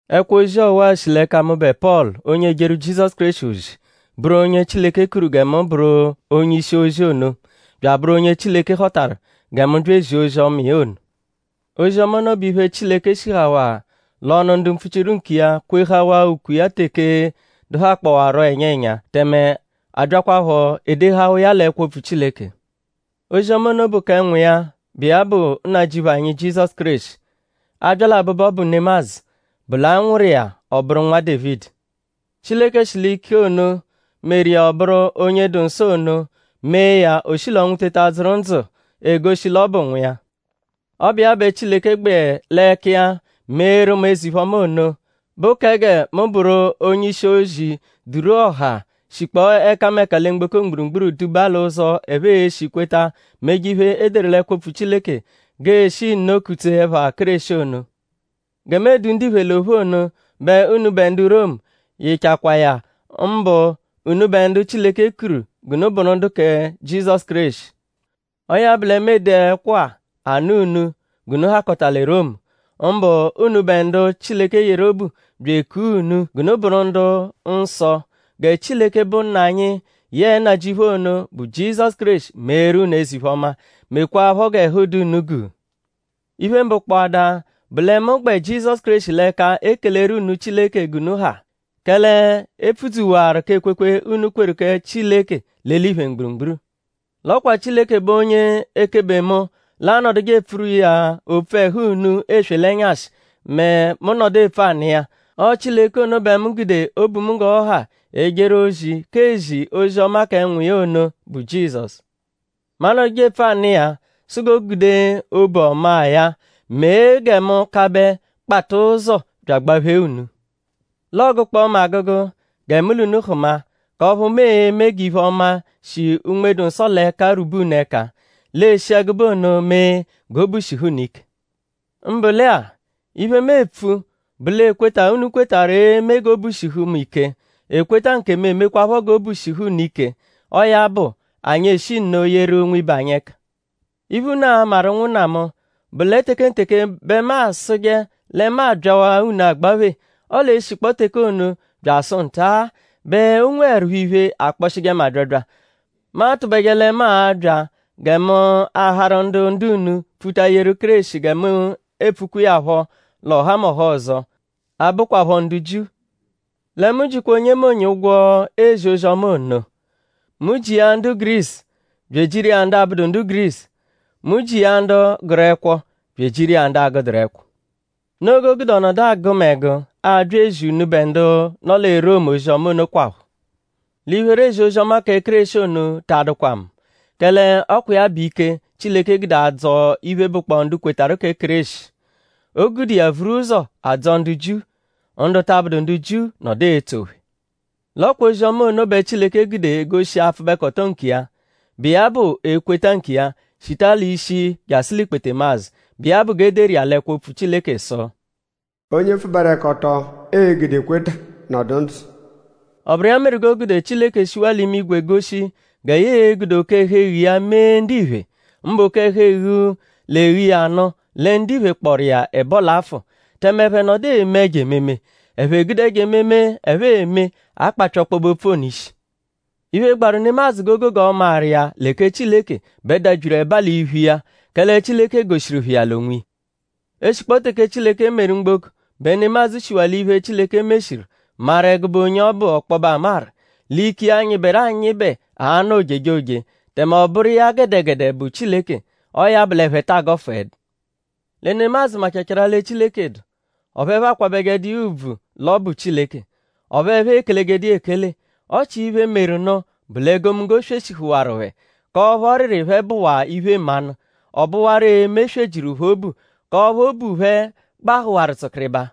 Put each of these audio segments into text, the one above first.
Ẹkwo-ozi ọwa-a shi l'ẹka mụbe Pọlu; onye ejeru Jizọsu Kéreshi ozi; bụru onye Chileke kuru gẹ mu bụru onye-ishi-ozi ono; bya abụru onye Chileke họtaru gẹ mu bya ezia ozi-ọma iya ono. Ozi-ọma ono bụ iphe, Chileke shihawaa l'ọnu ndu mpfuchiru nkiya kwehawaa ukwe iya teke dụhakpowaro ẹnya ẹnya; tẹme a byakwaphọ edehawa iya l'ẹkwo-opfu Chileke. Ozi-ọma ono bụ kẹ Nwa iya, bụ iya bụ Nnajịuphu anyi Jizọsu Kéreshi. A -bya l'abụbu, ọ bụ nemadzụ bụ l'a nwụru iya ọ bụru Nwa Dévidi. Chileke shi l'ike ono, meru iya ọ bụru onye dụ nsọ ono; mee ya o shi l'ọnwu teta dzụru ndzụ egoshi l'ọ bụ Nwa iya. Ọ bụ iya bẹ Chileke gbẹ l'ẹka iya meeru mu eze-iphe-ọma ono, bụ kẹ gẹ mu bụru onye-ishi-ozi duru ọha, shikpọo ẹkameka lẹ mgboko mgburugburu duba l'ụzo, ẹphe e-shi kweta; meje iphe, e deru l'ẹkwo-opfu Chileke g'eeshi nno kutsee ẹpha Kéreshi ono. Gẹ mu edu ndiphe l'ophu ono bẹ unubẹ ndu Romu yịchakwaa ya; mbụ unubẹ ndu Chileke kuru g'unu bụru kẹ Jizọsu Kéreshi. Ọo ya bụ lẹ mu ede ẹkwo-a anụ unu g'unu hakọta lẹ Romu; mbụ unubẹ ndu Chileke yeru obu bya ekua unu; g'unu bụru ndu-nsọ. Gẹ Chileke, bụ Nna anyi yẹe Nnajịuphu ono, bụ Jizọsu Kéreshi meeru unu eze-iphe-ọma; mekwaaphọ g'ẹhu dụ unu guu. Iphe mbụ kpọada bụ lẹ mu gbẹ Jizọsu Kéreshi l'ẹka ekeleru unu Chileke g'unu ha; kẹle e pfudzuwaru k'ekwekwe, unu kweru kẹ Chileke l'eliphe mgburugburu. L'ọ kwa Chileke bụ onye ekebe mu l'anọduje epfuru iya opfu ẹhu unu eswe l'ẹnyashi mẹ mu -nọdu epfu anụ iya. Ọo Chileke ono bẹ mu gude obu mu g'ọ ha ejeru ozi k'ezi ozi-ọma kẹ Nwa iya ono, bụ Jizọsu. Mu anọduje epfu anụ iya sụ g'o gude obu ọmaa ya mee gẹ mu kabẹ kpata ụzo bya agbaphee unu. L'ọogukpo mu agụgu gẹ mu l'unu hụma; k'ọphu mu e-me g'iphe-ọma, shi Unme-dụ-Nsọ l'ẹka rwube unu ẹka. L'eshi ẹgube ono mee g'obu shihu unu ike. Mbụ lẹ-a; iphe, mu epfu bụ l'ekweta, unu kwetarụ e-me g'obu shihu mu ike; ekweta nkemu emekwaaphọ g'obu shihu unu ike. Ọo ya bụ; anyi eshi nno yeru nwibe anyi ẹka. Iphe, unu a-maru; ụnwunna mu; bụ lẹ tekenteke bẹ mu asụje lẹ mu abyawaa unu agbaphe; ọle eshikpọo teke ono bya asụ nta-a bẹ o nweẹrupho iphe, akpọshije mu abyabya. Mu atụbeje lẹ mu a-bya gẹ mu aharu ndu ndu-unu pfuta yeru Kéreshi gẹ mu epfukwa iya phọ l'ọhamoha ọzo, abụkwapho ndu Jiu. Lẹ mu jikwa onyemonye ụgwo ezi ozi-ọma ono. Mu ji iya ndu Gurisu bya ejiru iya ndu abụdu ndu Gurisu. Mu ji iya ndu gụru ẹkwo; bya ejiru iya ndu agụduru ẹkwo. Noo g'o gude ọ nọdu agụ mu ẹgu abya ezi unubẹ ndu nọ lẹ Romu ozi-ọma onokwaphọ. L'iphere ezi ozi-ọma kẹ Kéreshi ono ta adụkwa mu. Kẹle ọ kwa iya bụ ike, Chileke gude adzọ iphe, bụkpoo ndu kwetarụ kẹ Kéreshi. O gude iya vuru ụzo adzọ ndu Jiu; ndu ta abụdu ndu Jiu nọdu etso phẹ. L'ọ kwa ozi-ọma ono bẹ Chileke gude egoshi apfụbekoto nkiya, bụ iya bụ ekweta nkiya, shita l'ishi jasụ l'ikpetemazụ; bụ iya bụ g'e deru iya l'ẹkwo-opfu Chileke sụ: “Onye pfụberekoto e-gude ekweta nọdu ndzụ.” Ọ bụru iya meru g'o gude Chileke shiwaa l'imigwe goshi gẹ ya e-gude oke-ẹhu-eghu iya mee ndiphe; mbụ oke-ẹhu-eghu, l'eghu iya nụ lẹ ndiphe kpọru iya ẹbo l'afụ; tẹme ẹphe nọdu eme ẹjo ememe. Ẹphe gude ẹjo ememe, ẹphe eme akpapya ọkpobe-opfu ono ishi. Iphe, gbaru nemadzụ g'o gogo maru iya lẹ kẹ Chileke bẹ dabyiru ẹba l'iphu iya; kẹle Chileke goshiru phẹ iya l'onwiya. Eshikpọo teke Chileke meru mgboko bẹ nemadzụ shiwaa l'iphe, Chileke meshiru maru ẹgube onye ọ bụ ọkpobe amaru. L'ike iya, nyịberu anyịbe a-nọ ojejoje; tẹme ọ bụru iya gẹdegede bụ Chileke. Ọo ya bụ l'ẹphe ta agọfuedu. Lẹ nemadzụ machachaarụ lẹ Chileke dụ; ọphu ẹphe akwabẹjedu iya ùbvù l'ọ bụ Chileke; ọphu ẹphe ekelejedu iya ekele. Ọ chia iphe, meru nụ bụ l'egomunggo sweshihụwaru phẹ; k'ọphu ọriri phẹ bụwaa iphe-mmanụ; ọ bụwaru eme eswe jiru phẹ obu; k'ọphu obu phẹ gbahụwaru tsụkiribaa.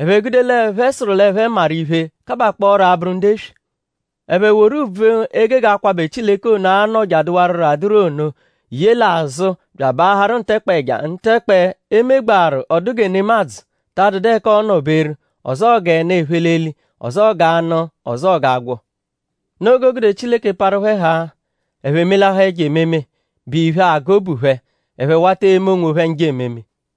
Ẹphe gude l'ẹphe sụru l'ẹphe maru iphe; kabakpọoro abụru ndu eswe. Ẹphe woru ùbvù, e gege akwabẹ Chileke ono, a-nọ je adụwaruro adụru ono ye l'azụ bya abaaharụ ntẹkpe ẹja; ntẹkpe, e megbaaru ọ dụ gẹ nemadzụ, ta adụdu ẹka ọo-nọ-beru; ọzoo g'ẹnu, ephe l'eli; ọzoo g'anụ; ọzoo g'agwọ. Noo g'o gude Chileke parụ phẹ haa; ẹphe melahaa ẹjo ememe, bụ iphe, agụ obu phẹ. Ẹphe wata eme onwophẹ njọ ememe.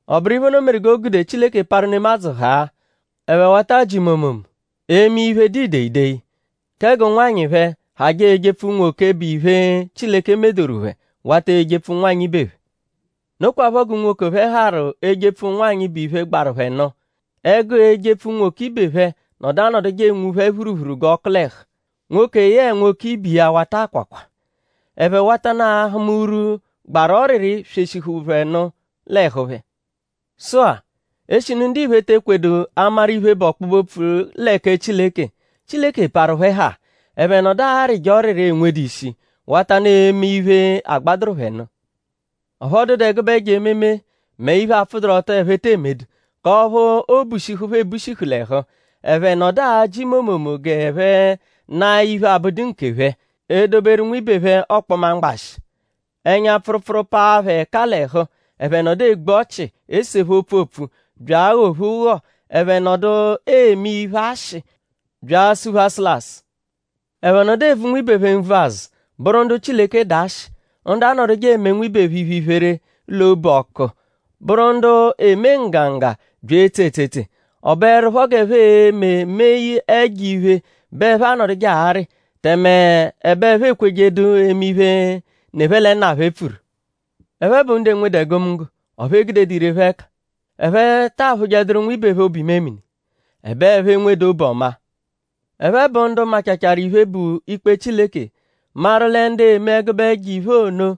Ọ bụru iphe ono meru g'o gude Chileke parụ nemadzụ haa; ẹphe wata ajị momomo; eme iphe dụ ideyideyi. Kẹ g'ụnwanyi phẹ hajẹ ejepfu unwoke, bụ iphe, Chileke medoru phẹ; wata ejepfu ụnwanyi ibe phẹ. Nokwaphọ g'unwoke phẹ harụ ejepfu ụnwanyi, bụ iphe, gbaru phẹ nụ; ẹgu ejepfu unwoke ibe phẹ nọdu anọduje enwu phẹ phuruphuru g'ọku l'ẹhu. Nwoke yẹe nwoke ibe iya wata akwakwa. Ẹphe watanụ ahụma urwu, gbaru ọriri, sweshihuru phẹ nụ l'ẹhu phẹ. Sụ-a; eshinu ndiphe te ekwedu amaru iphe, bụ ọkpobe-opfu lẹ kẹ Chileke; Chileke parụ phẹ haa; ẹphe nọdu arịje ọriri, enwedu ishi; watanụ eme iphe, agbadụru phẹ nụ. Ọphu ọ dụdu ẹgube ẹjo ememe; mẹ iphe, apfụduru-ọto, ẹphe te emedu; k'ọphu oobushihu phẹ ebushihu l'ẹhu. Ẹphe nọdu ajị momomo g'ẹphe naa iphe, abụdu nkephẹ; edoberu nwibe phẹ ọkpoma mgbashị. Ẹnya pfụrupfuru paa phẹ ẹka l'ẹhu; ẹphe nọdu egbu ọchi; esephe opfu opfu bya aghọ-phe ụgho; ẹphe nọdu eme iphe-ashị; bya asụ-phe asụlasu. Ẹphe nọdu evu nwibe phẹ nvu azụ; bụru ndu Chileke dụ ashị; ndu anọduje eme nwibe phẹ iphe-iphere l'obu ọku; bụru ndu eme nggangga bya etse etsetse. Ọ bụerupho g'ẹphe e-me mee ẹjo-iphe bẹ ẹphe anọduje arị; tẹme ẹbe ẹphe ekwejedu eme iphe, ne phẹ lẹ nna phẹ pfuru. Ẹphe bụ ndu enwedu egomunggo; ọphu e gudedu ire phẹ ẹka. Ẹphe ta aphụjeduru nwibe phẹ obu-imemini; ẹbe ẹphe enwedu obu-ọma. Ẹphe bụ ndu machachaarụ iphe, bụ ikpe Chileke; maru lẹ ndu eme ẹgube ẹjo-iphe ono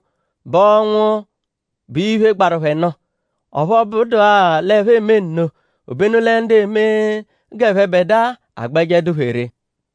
bụ ọnwu, bụ iphe, gbaru phẹ nụ. Ọphu ọ bụdua l'ẹphe eme nno; obenu lẹ ndu eme g'ẹphebedua agbẹje dụ phẹ ree.